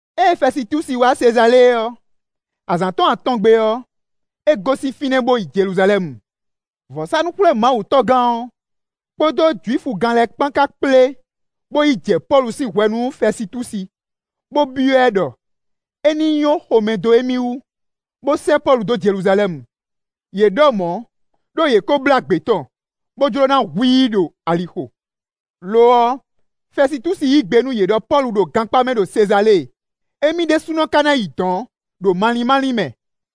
Ée Fɛsitúsi wá Sezalée ɔ́, azǎn tɔn atɔngbe ɔ́, é gosín fínɛ́ bó yi Jeluzalɛ́mu. Vɔ̌sánú-xwlémawutɔ́gán ɔ́, kpódó Jwifugán lɛ́ɛ kpán ka kplé bo yi jɛ Pɔ́lu sín hwɛ̌ nú Fɛsitúsi, bó byɔ́ ɛ ɖɔ é ní nyɔ́ xomɛ dó émí wú, bó sɛ́ Pɔ́lu dó Jeluzalɛ́mu. Yě ɖɔ mɔ̌ ɖó yě ko blá gbě tɔn, bó jló ná hu i ɖo alixo. Lo ɔ́, Fɛsitúsi yí gbe nú yě ɖɔ Pɔ́lu ɖo gankpá mɛ ɖo Sezalée, émí ɖésúnɔ ka ná yi dɔ̌n ɖo malín málín mɛ.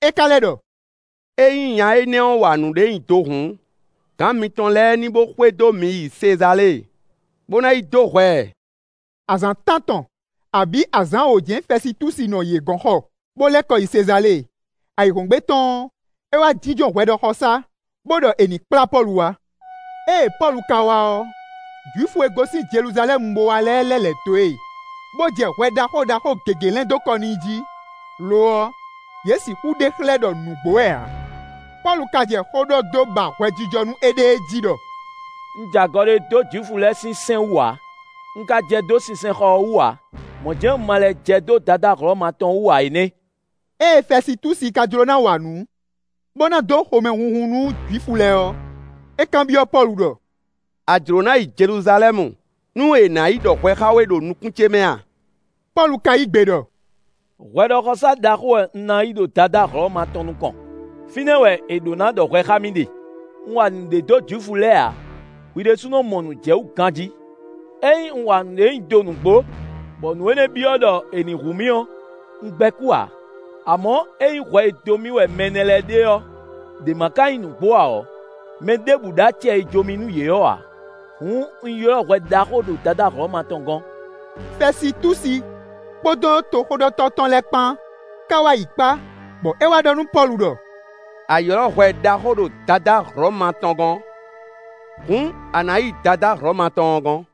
É ka lɛ́ ɖɔ: “Ényí nya énɛ́ wa nǔɖé nyi do hǔn, gǎn mitɔn lɛ́ɛ ní bó xwedó mì yi Sezalée, bó ná yi dó hwɛ ɛ.” Azǎn tántɔn, abǐ azǎn wǒ jɛ́n Fɛsitúsi nɔ yě gɔ̌n xɔ, bó lɛ́ kɔ yi Sezalée. Ayǐhɔ́ngbe tɔn ɔ́, é wá jínjɔ́n hwɛɖɔxɔsá, bó ɖɔ è nǐ kplá Pɔ́lu wá. Ée Pɔ́lu ka wá ɔ́, Jwifu e gosín Jeluzalɛ́mu bó wá lɛ́ɛ lɛ́ lɛ̌ dó e, bó jɛ hwɛ ɖaxó ɖaxó gěgé lɛ́n dó kɔ n'i jí; lo ɔ́, yě sixú ɖe xlɛ́ ɖɔ nǔgbó wɛ ǎ. Pɔ́lu ka jɛ xó ɖɔ dó ba hwɛjijɔ nú éɖée jí ɖɔ: “Un jɛ agɔ ɖé dó Jwifu lɛ́ɛ sín sɛ́n wú ǎ; un ka jɛ dó sinsɛnxɔ ɔ́ wú ǎ; mɔ̌ jɛ́n un ma lɛ́ jɛ dó Dadá Hlɔ̌ma tɔn wú ǎ é nɛ́.” Ée Fɛsitúsi ká jló ná wa nǔ bó ná dó xomɛhunhun nú Jwifu lɛ́ɛ ɔ́, é kanbyɔ́ Pɔ́lu ɖɔ: “A jló ná yi Jeluzalɛ́mu, nú è nǎ yi ɖɔ hwɛ xá we ɖo nukún ce mɛ a?” Pɔ́lu ka yí gbe ɖɔ: “Hwɛɖɔxɔsá ɖaxó wɛ un ná yi ɖo Dadá Hlɔ̌ma tɔn nukɔn; fínɛ́ wɛ è ɖǒ ná ɖɔ hwɛ xá mì ɖe; un wa nǔɖé dó Jwifu lɛ́ɛ ǎ; hwi ɖésúnɔ mɔ nǔ jɛ wú ganjí. Ényí un wa nǔɖé nyi do nǔgbó, bɔ nǔ énɛ́ ɔ́ byɔ́ ɖɔ è nǐ hu mì ɔ́, un gbɛ́ kú ǎ. Amɔ̌, ényí hwɛ e dó mì wɛ mɛ nɛ́ lɛ́ɛ ɖe ɔ́ ɖě ma ka nyí nǔgbó ǎ ɔ́, mɛ ɖěbǔ ɖó acɛ e jó mì nú yě ɔ́ ǎ. Hǔn un ylɔ́ hwɛ ɖaxó ɖo Dadá Hlɔ̌ma tɔn gɔ́n.” Fɛsitúsi kpódó toxóɖɔtɔ́ tɔn lɛ́ɛ kpán ka wá yi kpá, bɔ é wá ɖɔ nú Pɔ́lu ɖɔ: “A ylɔ́ hwɛ ɖaxó ɖo Dadá Hlɔ̌ma tɔn gɔ́n. Hǔn a nǎ yi Dadá Hlɔ̌ma tɔn ɔ́ gɔ́n.”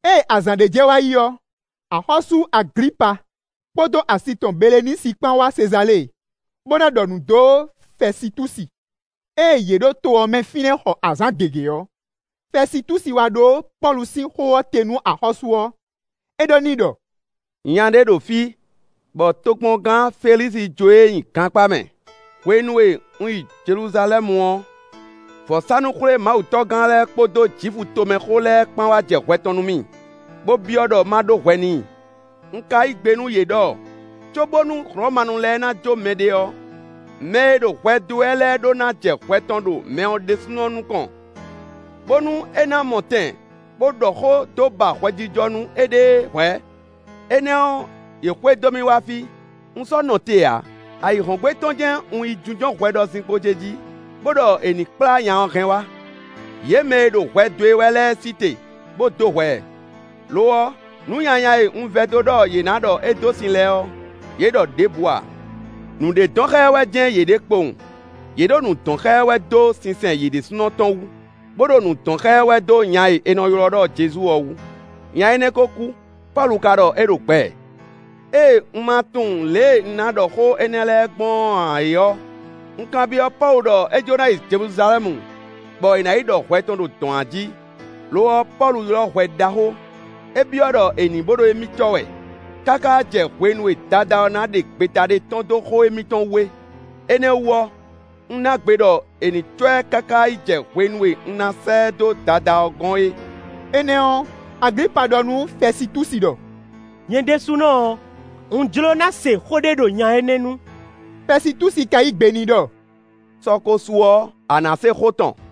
Ée azǎn ɖé jɛ wa yi ɔ́, axɔ́sú Aglipa kpódó asi tɔn Belenísi kpán wá Sezalée, bó ná ɖɔ nǔ dó Fɛsitúsi. Ée yě ɖo to ɔ́ mɛ fínɛ́ xɔ azǎn gěgé ɔ́, Fɛsitúsi wá ɖó Pɔ́lu sín xó ɔ́ te nú axɔ́sú ɔ́; é ɖɔ n'i ɖɔ: “Nya ɖé ɖo fí, bɔ tokpɔngán Felísi jó e nyi gankpá mɛ. Hwenu e un yi Jeluzalɛ́mu ɔ́, vɔ̌sánú-xwlémawutɔ́gán lɛ́ɛ kpódó Jwifu tomɛxó lɛ́ɛ kpán wá jɛ hwɛ tɔn nú mì, bó byɔ́ ɖɔ ma ɖó hwɛ n'i. Un ka yí gbe nú yě ɖɔ cóbónú Hlɔ̌manu lɛ́ɛ ná jó mɛɖé ɔ́, mɛ e ɖo hwɛ dó e wɛ lɛ́ɛ ɖó ná jɛ hwɛ tɔn ɖo mɛ ɔ́ ɖésúnɔ nukɔn, bónú é ná mɔ tɛn, bó ɖɔ xó dó ba hwɛjijɔ nú éɖée hwɛ̌. Énɛ́ ɔ́, yě xwedó mì wá fí; un sɔ́ nɔ te ǎ; ayǐhɔ́ngbe tɔn jɛ́n un yi jínjɔ́n hwɛɖɔzinkpo ce jí, bó ɖɔ è ní kplá nya ɔ́ hɛn wá. Yě mɛ e ɖo hwɛ dó e wɛ lɛ́ɛ sí te, bó dó hwɛ ɛ; lo ɔ́, nǔ nyanya e un vɛdó ɖɔ yě na ɖɔ é dó sin lɛ́ɛ ɔ́, yě ɖɔ ɖěbǔ ǎ. Nǔɖé dɔn xá ɛ wɛ jɛ́n yě ɖe kpowun; yě ɖo nǔ dɔn xá ɛ wɛ dó sinsɛn yě ɖésúnɔ tɔn wú, bó ɖo nǔ dɔn xá ɛ wɛ dó nya e è nɔ ylɔ́ ɖɔ Jezu ɔ́ wú. Nya énɛ́ ko kú; Pɔ́lu ka ɖɔ é ɖo gbɛ. Ée un ma tunwun lě e un ná ɖɔ xó énɛ́ lɛ́ɛ gbɔn ǎ é ɔ́, un kanbyɔ́ Pɔ́lu ɖɔ é jló ná yi Jeluzalɛ́mu, bɔ è nǎ yi ɖɔ hwɛ tɔn ɖo dɔ̌n a jí; lo ɔ́, Pɔ́lu ylɔ́ hwɛ ɖaxó: é byɔ́ ɖɔ è ní bo ɖo émí cɔ́ wɛ káká jɛ hwenu e Dadá ɔ́ ná ɖe gbeta ɖé tɔ́n dó xó émítɔn wú é; énɛ́ ɔ́ wú ɔ́, un ná gbe ɖɔ è ní cɔ́ ɛ káká yi jɛ hwenu e un ná sɛ́ ɛ dó Dadá ɔ́ gɔ́n é.” Énɛ́ ɔ́, Aglipa ɖɔ nú Fɛsitúsi ɖɔ: “Nyɛ ɖésúnɔ ɔ́, un jló ná se xó ɖé ɖo nya énɛ́ nu.” Fɛsitúsi ka yí gbe n'i ɖɔ: “Sɔ ko su ɔ́, a na se xó tɔn.”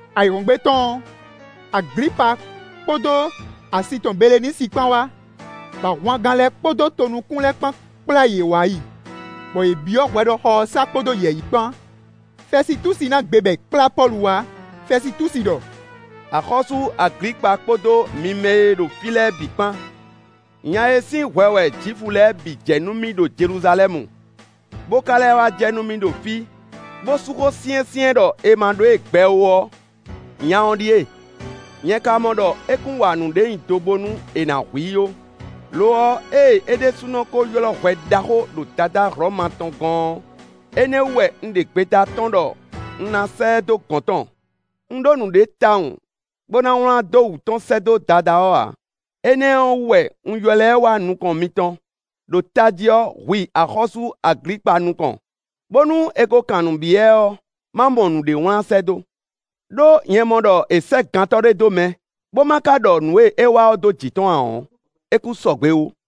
Ayǐhɔ́ngbe tɔn ɔ́, Aglipa kpódó asi tɔn Belenísi kpán wá, bɔ ahwangán lɛ́ɛ kpódó tonukún lɛ́ɛ kpán kplá yě wa yi, bɔ yě byɔ́ hwɛɖɔxɔ ɔ́ sá kpódó yɛ̌yi kpán. Fɛsitúsi ná gbe bɔ è kplá Pɔ́lu wá. Fɛsitúsi ɖɔ: “Axɔ́sú Aglipa kpódó mi mɛ e ɖo fí lɛ́ɛ é bǐ kpán; nya e sín hwɛ wɛ Jwifu lɛ́ɛ bǐ jɛ nú mì ɖo Jeluzalɛ́mu, bó ka lɛ́ wá jɛ nú mì ɖo fí, bó sú xó syɛ́nsyɛ́n ɖɔ è ma ɖó e gbɛ ó ɔ́, nya ɔ́ ɖíe. Nyɛ ka mɔ ɖɔ é kún wa nǔɖé nyi do bónú è nǎ hu i ó. Lo ɔ́, ée é ɖésúnɔ ko ylɔ́ hwɛ ɖaxó ɖo Dadá Hlɔ̌ma tɔn gɔ́n ɔ́, énɛ́ ɔ́ wú wɛ un ɖe gbeta tɔ́n ɖɔ un ná sɛ́ ɛ dó gɔ̌n tɔn. Un ɖó nǔɖé tawun bó ná wlán dó wǔ tɔn sɛ́ dó Dadá ɔ́ ǎ. Énɛ́ ɔ́ wú wɛ un ylɔ́ ɛ wá nukɔn mitɔn, ɖo tají ɔ́, hwi axɔ́sú Aglipa nukɔn, bónú è ko kan nǔ byɔ́ ɛ ɔ́, ma mɔ nǔɖé wlán sɛ́ dó. Đó nyɛ mɔ ɖɔ è sɛ́ gantɔ́ ɖé dó mɛ, bó ma ka ɖɔ nǔ e é wa ɔ́ dó jǐ tɔn ǎ ɔ́, é kún sɔgbe ó.”